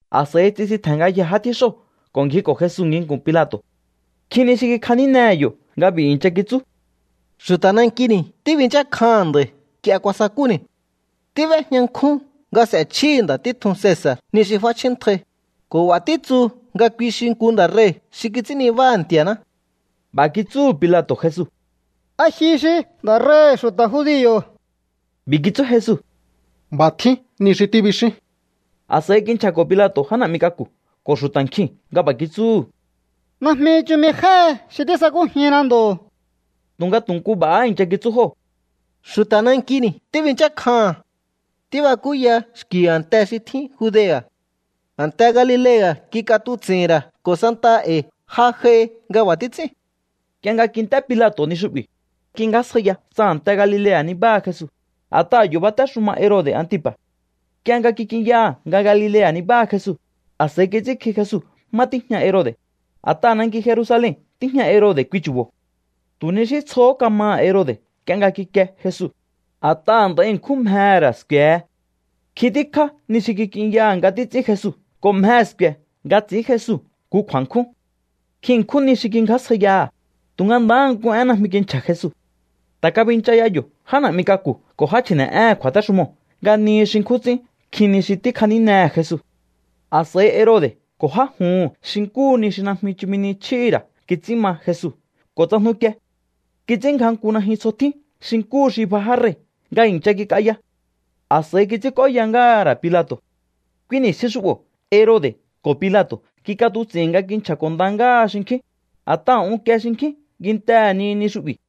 A̱s'a̱i tsisintje̱n ngayjee̱ já tjíxóo̱ ko̱ ngjiko̱ Jesu nginku̱n Pilato̱. Nkjin ni xi kikjanínehe̱ yo̱ nga b'i̱ i̱ncha kitsú: —Xu̱ta̱ nankini̱ tíbinchákjaha̱n nda̱i̱ nk'ie kuasakúni̱. Tíb'éjña nkjún nga s'e̱chjíhi̱ nda̱ títjun Cesa̱r ni xi f'áchjíntjai, ko̱ b'a̱ títsu nga kui xi nku nda̱ rei̱ xi kits'ín nibáha̱ Nti̱a̱ná. B'a̱ kitsúhu̱ Pilato̱ Jesu: —¿A ji xi nda̱ rei̱hi̱ xu̱ta̱ judio̱? B'i̱ kitsú Jesu: —B'a̱ tjín ni xi tíbixín. A̱s'a̱i kinchja̱ko̱ Pilato̱ já na̱'mi k'aku̱ ko̱ xu̱ta̱ nkjiu̱n nga b'a̱ kitsúhu̱: —Najmi chumi jéhe xi tísakújinna ndo̱. Tu̱nga tu̱ nku b'a̱há i̱ncha kitsú jóo̱: —Xu̱ta̱ nankini̱ tíbinchákjaha̱n. Tíbakúya xki̱ a̱nte xi tjín Judea̱. A̱nte Galilea̱ kik'atuts'i̱hi̱n ra̱ ko̱ santaha e̱i̱ ja j'ai nga b'a̱ títs'ín. Nk'ie nga kint'é Pilato̱ ni xu'bi̱, kingjásjaiya tsa a̱nte Galilea̱ nibáha Jesu, a̱t'aha̱ yo̱ batéxuma Herode̱ Antipa̱. Nk'ie nga kik'inyaha̱ nga Galilea̱ nibáha Jesu, a̱s'a̱i kits'ínkji Jesu má tíjña Herode̱, a̱t'aha̱ nanki Jerusalen tíjña Herode̱ kui chu̱bo̱. Tu̱ ni xí tsjohó kamaha̱ Herode̱ nk'ie nga kikie Jesu, a̱t'aha̱ nd'a̱i ṉkjún mjehe̱ ra̱ sku̱e̱he. Nkjin tíkjá ni xi kik'inyaha̱ nga títs'ín Jesu ko̱ mjehe̱ sku̱e̱ nga ts'i̱ín Jesu nku kju̱a̱nkjún. Nkjin ṉkjún ni xi kingjásjaiyaha̱, tu̱nga ndahá nku én najmi kinchja̱ Jesu. Ta̱ kabincha ya yo̱ já na̱'mi k'aku̱ ko̱ já chji̱ne̱'éhe̱n kju̱a̱téxumoo̱ nga nihi xi nkjún ts'ín nkjin ni xi tíkjanínehe̱ Jesu. A̱s'a̱i Herode̱ ko̱ já juhu̱n xi nkúhu ni xi najmi chumi ni chjíhi̱ ra̱ kits'ín ma Jesu ko̱ tsajnukie. Kits'ínngja nku najyun tsjo tjín xi nkúhu xi bja já rei̱ nga i̱ncha kik'aya. A̱s'a̱i kits'ínk'óya ngáha̱ ra̱ Pilato̱. Kui ni̱stjin xu'bo̱ Herode̱ ko̱ Pilato̱ kik'atuts'i̱hi̱n nga kinchja̱ko̱ nda ngáha xinkjín, a̱t'aha̱ unkie xinkjín kintehe̱ ni ni xu'bi̱.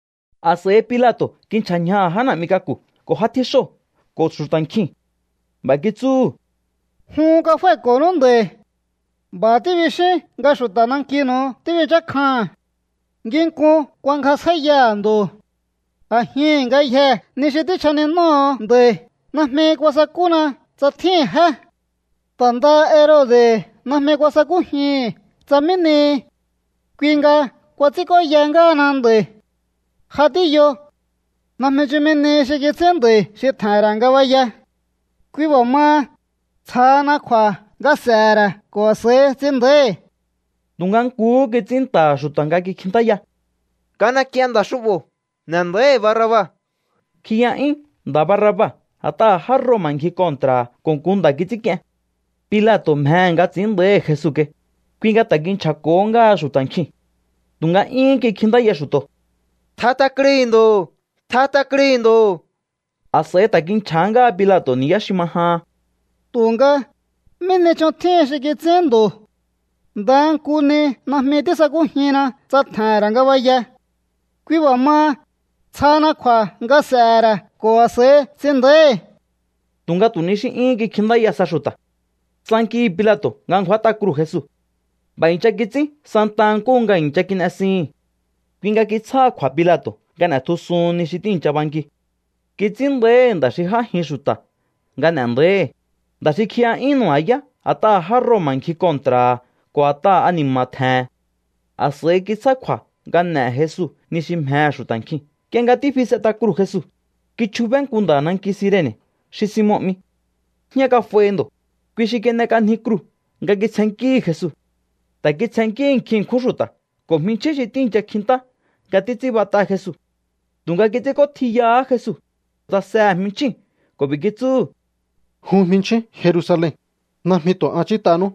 A̱s'a̱i Pilato̱ kinchja̱ ñjaha̱ já na̱'mi k'aku̱ ko̱ já tjíxóo̱ ko̱ xu̱ta̱ nkjiu̱n. B'a̱ kitsúhu̱: —Jun kafái̱ko̱nú nda̱i̱. B'a̱ tíbixíún nga xu̱ta̱ nankinu̱u tíbinchákjaha̱n. Nginkun kuangjasjáíyaha̱ ndo̱. A̱jihi̱n ngayjee̱ ni xi tíchjaninóho̱o nda̱i̱ najmi kuasakúna tsa tjíhi̱n jé. Ta̱ ndaha Herode̱ najmi kuasakújihi̱n tsa mí nihi. Kui nga kuats'ínk'óya ngáhana nda̱i̱. Ja tíyo. Najmi chumi nihi xi kits'ín nda̱i̱ xi tje̱he̱n ra̱ ngabaya. Kui b'a̱ maha, tsjahana kju̱a̱ nga s'e̱he̱ ra̱ ko̱ a̱s'a̱i ts'in nda̱íhi̱. Tu̱nga nkuhú kits'ín nta̱ha̱ xu̱ta̱ nga kikjintáya: —¡Kan'ek'ien nda̱ xu'bo̱! ¡N'e̱ nda̱íhi̱ Barraba! Kjiya'yún nda̱ Barraba a̱t'aha̱ já Roma̱ ngji kontra̱ha̱ ko̱ nku nda̱ kits'ínk'ien. Pilato̱ mjehe̱ nga ts'i̱ín nda̱íhi̱ Jesu kai, kui nga ta̱ kinchja̱ko̱hó ngáha xu̱ta̱ nkjiu̱n. Tu̱nga 'yún kikjintáya xu̱to̱: —¡Tjat'a krui̱ ndo̱! ¡Tjat'a krui̱ ndo̱! A̱s'a̱i ta̱ kinchja̱há ngáha Pilato̱ ni̱yá xi ma jahan: —Tu̱nga, ¿mí ni ch'on tjíhin xi kits'ín ndo̱? Ndaha nku ni najmi tísakújinna tsa tje̱he̱n ra̱ ngabaya. Kui b'a̱ maha, tsjahana kju̱a̱ nga s'e̱he̱ ra̱ ko̱ a̱s'a̱i ts'in nda̱íhi̱. Tu̱nga tu̱ ni xí 'yúhún kikjintáya sa xu̱ta̱. Tsankihi̱ Pilato̱ nga ngju̱át'a kruu̱ Jesu. B'a̱ i̱ncha kits'ín santaha nkúhu nga i̱ncha kin'esihi̱n. Kui nga kitsjáha kju̱a̱ Pilato̱ nga n'e̱tjusuhun ni xi tíi̱ncha banki. Kits'ín nda̱íhi̱ nda̱ xi j'ájin xu̱ta̱ nga n'e̱ nda̱íhi̱, nda̱ xi kjiya'yún nu̱ba̱yá a̱t'aha̱ já Roma̱ ngji kontra̱ha̱ ko̱ a̱t'aha̱ ani̱ma̱ tje̱he̱n. A̱s'a̱i kitsjá kju̱a̱ nga n'e̱he̱ Jesu ni xi mjehe̱ xu̱ta̱ nkjiu̱n. Nk'ie nga tífi s'et'a kruu̱ Jesu, kichjubé nku nda̱ nanki Sirene̱ xi Simon 'mi. Jñá kaf'aihi ndo̱. Kui xi kin'ek'anji kruu̱ nga kitsjennkíhi̱ Jesu. Ta̱ kitsjennkíhi̱ nkjin ṉkjún xu̱ta̱ ko̱ jminchjín xi tíi̱ncha kjintá nga títs'ínbat'a Jesu. Tu̱nga kits'ínk'ótjiyahá Jesu, tsasehe̱ jminchjíu̱n ko̱ b'i̱ kitsúhu̱: —Jun jminchjín Jerusalen, najmi tu̱ an ch'ít'anú.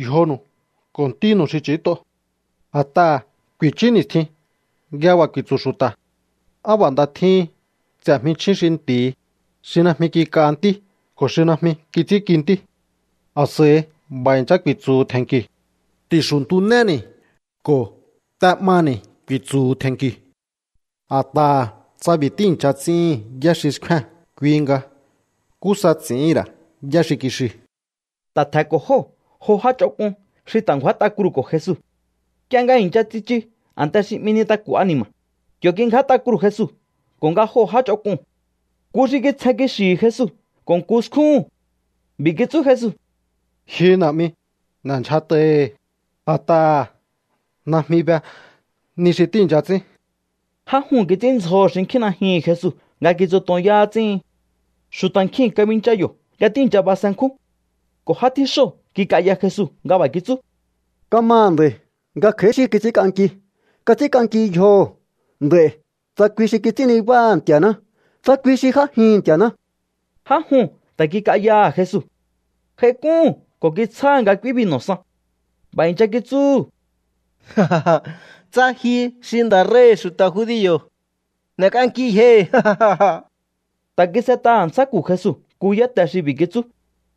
Yjonu̱u ko̱ ntínu̱u xi ch'i̱ít'o. A̱t'aha̱ ku̱i̱chú ni̱stjin nga b'a̱ ku̱i̱tsu̱ xu̱ta̱: “Á b'a̱ nda tjíhin ts'e̱ jminchjín xi nti̱hi, xi najmi kik'a ntí ko̱ xi najmi kits'ínki ntí.” A̱s'a̱i b'a̱ i̱ncha ku̱i̱tsu̱hu̱ tje̱nki̱u̱: “Ti̱xuntunéni̱.” Ko̱: “T'e'mani̱”, ku̱i̱tsu̱hu̱ tje̱nki̱u̱. A̱t'aha̱ tsa b'i̱ tíi̱ncha ts'íhi̱n yá xi xkfée̱n, kui nga, ¿nkú sa ts'i̱íhi̱n ra̱ yá xi kixiu̱? Ta̱ tje̱nko̱ jóo̱ jo já ch'onk'un xi ta̱ ngju̱át'a kruu̱ko̱ Jesu. Nk'ie nga i̱ncha tsichu a̱nte xi 'mi Nintaku̱ Ani̱ma̱, yo̱ kingját'a kruu̱ Jesu ko̱ nga joo̱ já ch'onk'uu̱n. Nku xi kitsjen kixi̱hi̱ Jesu ko̱ nku skjúhu̱n. B'i̱ kitsú Jesu: —Ji Na̱'mi, n'e̱ndyjat'aihi̱, a̱t'aha̱ najmi be ni xi tíi̱ncha ts'ín. Já juu̱n kits'ínndzjoho̱ xinkjín najyuhu̱n Jesu nga kitsutonyá ts'íhin. Xu̱ta̱ nkjiu̱n kabincha yo̱ nga tíi̱ncha basenkjún. Ko̱ já tjíxóo̱ kik'aya Jesu nga b'a̱ kitsú: —Kamaha̱ nda̱i̱ nga kj'a̱í xi kits'ínk'anki. Kats'ínk'anki yjoho̱ nd'a̱i̱ tsa kui xi kits'ín nibáha̱ Nti̱a̱ná, tsa kui xi j'ájihi̱n Nti̱a̱ná. Já juu̱n ta̱ kik'ayaha̱ Jesu. J'aik'úhu̱n ko̱ kitsjáha̱ nga k'úí binu̱ san. B'a̱ i̱ncha kitsúhu̱: —Tsa ji xi nda̱ rei̱hi̱ xu̱ta̱ judio̱, n'e̱k'anki yjohi̱. Ta̱ kis'et'a a̱ntsjáku̱ Jesu nku yáte xi b'i̱ kitsú: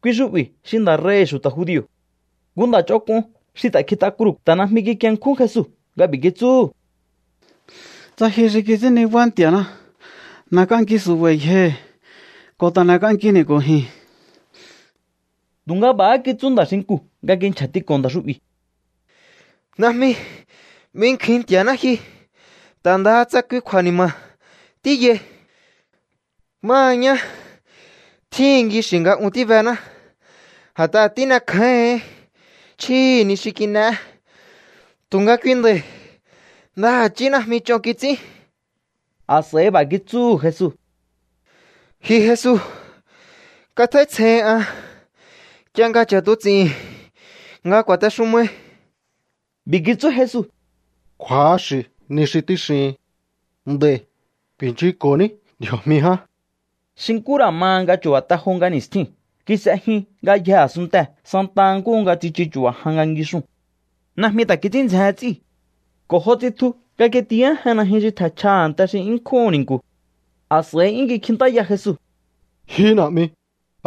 “Kui xu'bi̱ xi nda̱ rei̱hi̱ xu̱ta̱ judio̱.” Nku nda̱ ch'onk'un xi ta̱ kjit'a kruu̱ ta̱ najmi kikienkjún Jesu nga b'i̱ kitsúhu̱: —Tsa ji xi kits'ín nibá Nti̱a̱ná, n'e̱k'anki su̱ba̱i̱ yjohi̱ ko̱ ta̱ n'e̱k'ankini̱ ko̱ ji̱n. Tu̱nga b'a̱há kitsú nda̱ xinkuu̱ nga kinchja̱tiko̱ nda̱ xu'bi̱: —Najmi binkjuin Nti̱a̱ná ji, ta̱ ndaha tsa ta̱ kui kju̱a̱ni̱ma̱ha tíyai. Máha ñá, tjíhi̱n kixi̱ nga un tíbená, a̱t'aha̱ tín'ekjáíhi̱ín chjíhi̱ ni xi kin'eé. Tu̱nga kui nda̱i̱ ndaha̱chí najmi ch'on kits'ín. A̱s'a̱i b'a̱ kitsúhu̱ Jesu: —Ji Jesu, katj'áítsjeihin an nk'ie nga ch'a̱tuts'i̱hi̱n nga ku̱a̱texumai. B'i̱ kitsú Jesu: —Kju̱axi̱ ni xi tíxihin. Nd'a̱i̱ ku̱i̱nchunko̱ní ndji̱o̱jmi ján. Xi nkú ra̱ ma nga chu̱ba̱ te jo nga ni̱stjiu̱n kis'e jyun ngayjee̱ a̱sunntee̱ santa nkúhu nga tsichu chu̱ba̱ jan nga ngixuu̱n. Najmi ta̱ kits'ín ndzjehen ts'íu̱. Ko̱ jo tsitju nga kitiyájen najyun xi tje̱nchja a̱nte xi 'yún nkjúhu̱n ni̱nku̱. A̱s'a̱i 'yún kikjintáya Jesu: —Ji Na̱'mi,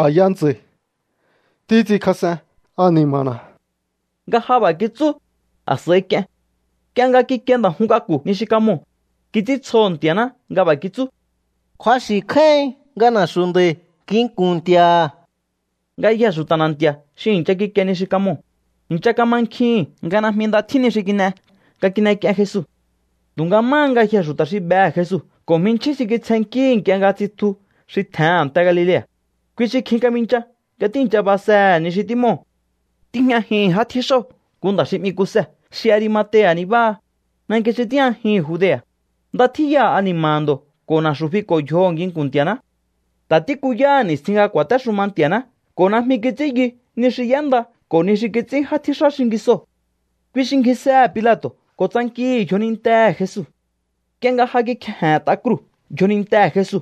a̱ya ntsa̱i̱ títs'inkjas'en ani̱ma̱na̱. Nga ja b'a̱ kitsú, a̱s'a̱i k'ien. Nk'ie nga kikie nda̱ jun k'aku̱ ni xi kamoo̱, kits'íntsjoho̱ Nti̱a̱ná nga b'a̱ kitsú: —Kju̱axi̱ kjáíhin nga na̱xu̱ nda̱i̱ nginku̱n Nti̱a̱ha̱. Ngayjee̱ xu̱ta̱ na̱nti̱a̱ xi i̱ncha kikie ni xi kamoo̱, i̱ncha kamankjihi̱n nga najmi nda tjín ni xi kin'e nga kin'ek'ien Jesu. Tu̱nga máha ngayjee̱ xu̱ta̱ xi behe̱ Jesu ko̱ jminchjín xi kitsjennkíhi̱ nk'ie nga tsitju xi tje̱hen a̱nte Galilea̱, kui xi kjin kabincha nga tíi̱ncha basehe̱ ni xi tímoo̱. Tíjñajihi̱n já tjíxóo̱ nku nda̱ xi 'mi Kuse xi Arimatea̱ nibáha, nanki xi tíjñajihi̱n Judea̱. Nda tjíya ani̱ma̱ha̱ ndo̱ ko̱ na̱xu̱ fiko̱ yjoho̱ nginku̱n Nti̱a̱ná. Ta̱ tíkuyaha̱ ni̱stjin nga ku̱a̱téxuma Nti̱a̱ná ko̱ najmi kits'ín yu ni xi y'énda ko̱ ni xi kits'ín já tjíxá xingisoo̱. Kui xi ngjisehe̱ Pilato̱ ko̱ tsankihi̱ yjonintehe̱ Jesu. Nk'ie nga ja kikjeje̱nt'a kruu̱ yjonintehe̱ Jesu,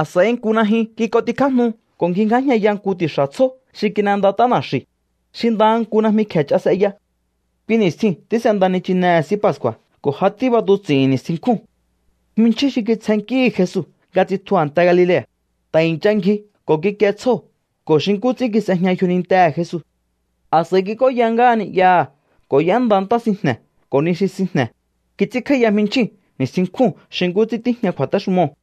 a̱s'a̱i nku najyun kik'ontjikjájnu ko̱ ngjingjájñaya nku ti̱xa̱ tsjó xi kin'endat'á na̱xi̱u̱, xi ndaha nku najmi kje̱ ch'a s'eya. Kui ni̱stjiu̱n tís'enda nichinehe̱ S'í Pascu̱a̱ ko̱ ja tíb'atuts'i̱hi̱n ni̱stjin nkjúu̱n. Jminchjín xi kitsjennkíhi̱ Jesu nga tsitju a̱nte Galilea̱, ta̱ i̱ncha ngji ko̱ kikie tsjóo̱ ko̱ xi nkú ts'ín kis'ejña yjonintehe̱ Jesu. A̱s'a̱i kik'óya ngáha ni'yaha̱ ko̱ y'énda ntá sinjne̱ ko̱ ni xi sinjne̱. Kits'ínkj'áíya jminchjíu̱n ni̱stjin nkjúu̱n xi nkú ts'ín tíjña kju̱a̱téxumoo̱.